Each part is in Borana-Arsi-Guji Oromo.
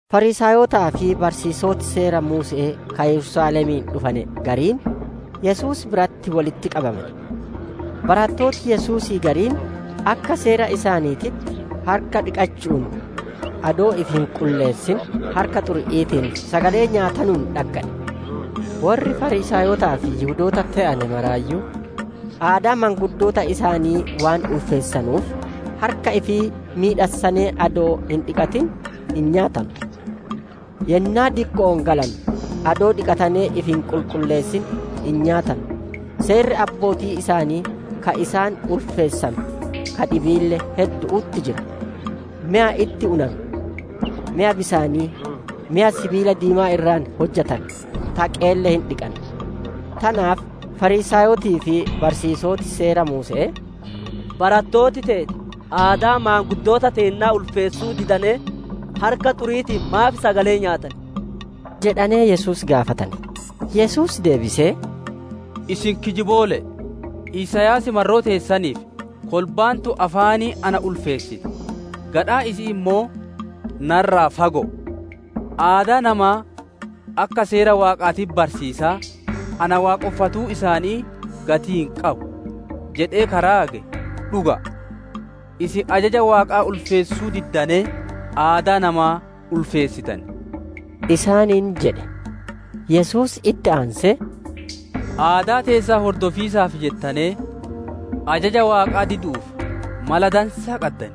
Fariisaayotaa fi barsiisoti seera Muuse'ee ka Yerusaalemii dhufane gariin, Yesuus biratti wolitti qabamane. Barattooti Yesuusii gariin, akka seera isaaniititti, harka dhiqachu'uun adoo ifi hin qulleessin harka xuri'iitiin sagalee nyaatanuun dhaggane. Worri Fariisaayotaa fi Yihudoota te'ane maraayyuu, aadaa maanguddoota isaanii waan ulfeessanuuf, harka ifii miidhassanee adoo hin dhiqatin hin nyaatanu. Yennaa dikko'oo galanu adoo dhiqatanee ifi hin qulleessin hin nyaatanu. Seerri abbootii isaanii ka isaan ulfeessanu ka dhibiille heddu'utti jira; meya itti unanu, meya bisaanii, meya sibiila diimaa irraa hojjatame, [taqeelle] hin dhiqan. Tanaaf Fariisaayotii fi barsiisoti Seera Muuse'ee, «Barattooti teeti aadaa maanguddoota teennaa ulfeessuu didanee harka xuri'iitiin maaf sagalee nyaatan?» jedhanee Yesuus gaafatane. Yesuus deebisee, «Isin kijiboole'e! Isaayaas marroo teessaniif: ‹Kolbaan tun afaaniin na ulfeessiti; gadhaan isi'ii ammoo na irraa fago'oo. Aadaa namaa akka seera Waaqaatitti barsiisaa, na waaqonfatuun isaanii gatii hin qabu› jedhee ka raage dhuga'a. «Isin ajaja Waaqaa ulfeessuu diddanee, aadaa namaa ulfeessitan» isaaniin jedhe. Yesuus itti aansee, «Aadaa teessan hordofiisaaf jettanee ajaja Waaqaa didu'uuf mala dansaa qaddan.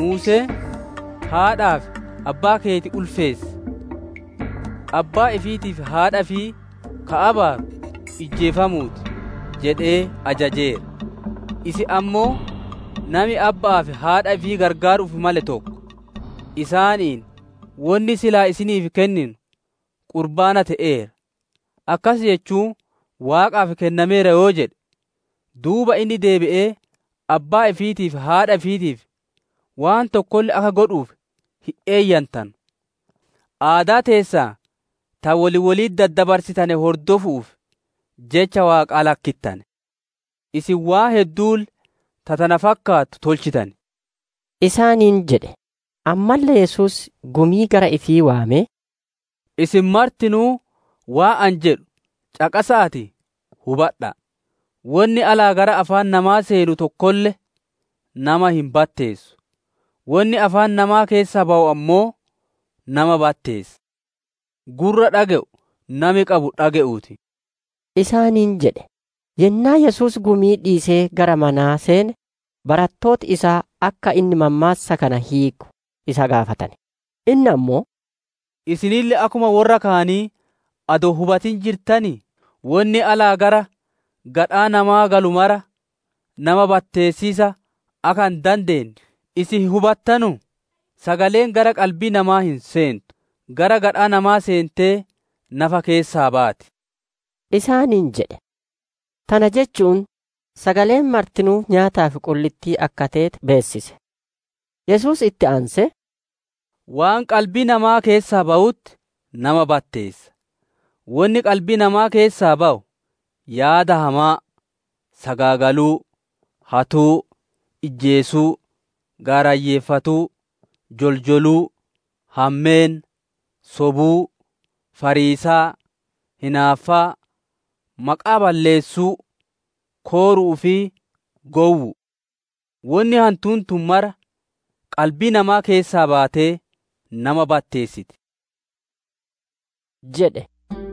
Muuseen, ‹Haadhaa fi abbaa keeti ulfeessi!›, ‹Abbaa ifiitii fi haadha ifii ka abaaru ijjeefamuu ti› jedhee ajajeera. Isin ammoo nami abba'aa fi haadha ifii gargaaru'uuf male tokko, isaaniin, wonni silaa isiniif kennu, ‹Qurbaana te'eera› akkas jechuun Waaqaaf kennameera yoo jedhe, duuba inni deebi'ee abbaa ifiitii fi haadha ifiitiif waan tokkolle akka godhuuf hin eeyyantanu. Aadaa teessan ta wol wolitti daddabarsitane hordofu'uuf jecha Waaqaa lakkittane. Isin waan hedduulle ta tana fakkaattu tolchitan» isaaniin jedhe. Ammaalle Yesuus gumii gara ifii waamee, «Isin martinuu waan ani jedhu caqasa'aatii hubadha'a! Wonni alaa gara afaan namaa seenu tokkolle nama hin batteessu; wonni afaan namaa keessaa bawu ammoo nama batteessa. [ Gurra dhage'u nami qabu dhage'uu ti]» isaaniin jedhe. Yennaa Yesuus gumii dhiisee gara manaa seene, barattooti isaa akka inni mammaassa kana hiiku isa gaafatane. Inni ammoo, «Isinille akkuma worra kaanii adoo hin hubatin jirtanii? Wonni alaa gara gadhaa namaa galu maraa nama batteessiisa akka hin dandeenne isin hin hubattanuu? Sagaleen gara qalbii namaa hin seentu; gara gadhaa namaa seentee nafa keessaa baati» isaaniin jedhe. Tana jechu'uun sagaleen martinuu nyaataaf qullittii akka teete beessise. Yesuus itti aansee, «Waan qalbii namaa keessaa bawutti nama batteessa. Wonni qalbii namaa keessaa bawu: yaada hamaa, sagaagaluu, hatuu, ijjeesuu, gaarayyeeffatuu, joljoluu, hammeenna, sobuu, fariisaa, hinaaffaa, maqaa balleessuu, kooru'uu fi gowwu'u. Wonni hantuun tun mara qalbii namaa keessaa baatee nama batteessiti» jedhe.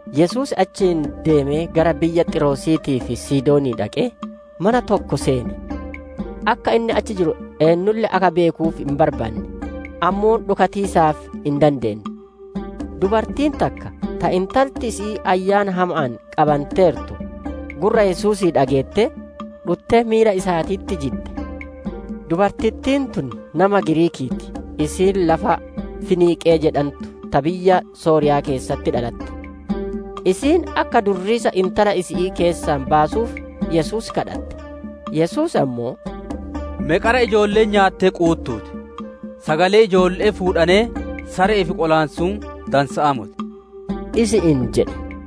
Yesuus achii deemee gara biyya Xiiroosiitii fi Sidoonii dhaqee, mana tokko seene. Akka inni achi jiru eennulle akka beekuuf hin barbaanne; ammoo dhokatiisaaf hin dandeenne. Dubartiin takka, ta intalti isi'ii ayyaana hama'aan qabanteertu, gurra Yesuusii dhageettee, dhuttee miila isaatitti jidde. Dubartittiin tun nama Giriikii ti; isiin lafa Finiqee jedhantu ta biyya Sooriya'aa keessatti dhalatte. Isiin akka durriisa intala isi'ii keessaa baasuuf Yesuus kadhatte. Yesuus ammoo, «Me qara ijoolleen nyaattee quuttuu ti; sagalee ijoolle'ee fuudhanee sare'eef qolaansuun dansa'aa moti» isi'iin jedhe.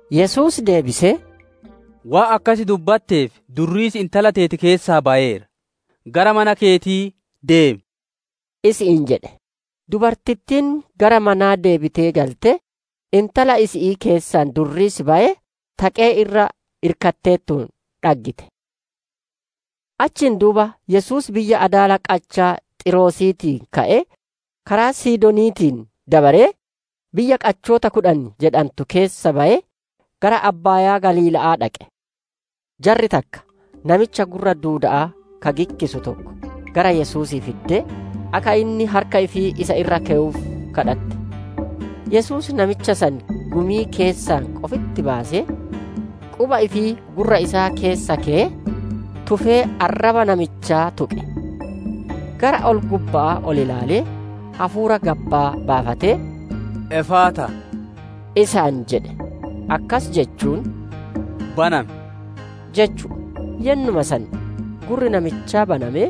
Yesuus deebisee, «Waan akkas dubbatteef, durriisi intala teeti keessaa bayeera; gara mana keetii deemi» isi'iin jedhe. Dubartittiin gara manaa deebitee galtee, intala isi'ii keessaa durriisi bayee, taqee irra irkatteertuun dhaggite. Achiin duuba Yesuus biyya adaala qachaa Xiiroosiitii ka'ee, karaa Sidooniitiin dabaree, biyya qachoota kudhan jedhantu keessa bayee, gara abbaayaa Galiila'aa dhaqe. Jarri takka, namicha gurra duuda'aa ka gikkisu tokko, gara Yesuusii fiddee, akka inni harka ifii isa irra kewuuf kadhatte. Yesuus namicha san gumii keessaa qofitti baasee, quba ifii gurra isaa keessa keyee, tufee arraba namichaa tuqe; gara ol-gubba'aa ol ilaalee hafuura gabbaa baafatee, «Efaataa» isaan jedhe. Akkas jechuun, «Banami!» jechu'u. Yennuma san, gurri namichaa banamee,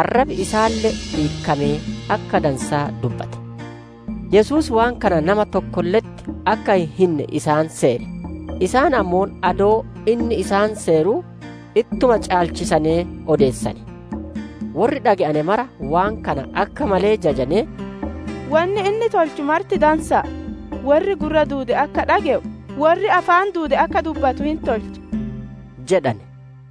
arrabi isaalle hiikamee akka dansaa dubbate. Yesuus waan kana nama tokkolle'etti akka hin hinne isaan seere; isaan ammoo adoo inni isaan seeruu, ittuma caalchisanee odeessane. Worri dhage'ane mara waan kana akka malee jajanee, «Wonni inni tolchu marti dansa'a! Worri gurra duude akka dhage'u, worri afaan duude akka dubbatu hin tolcha» jedhane.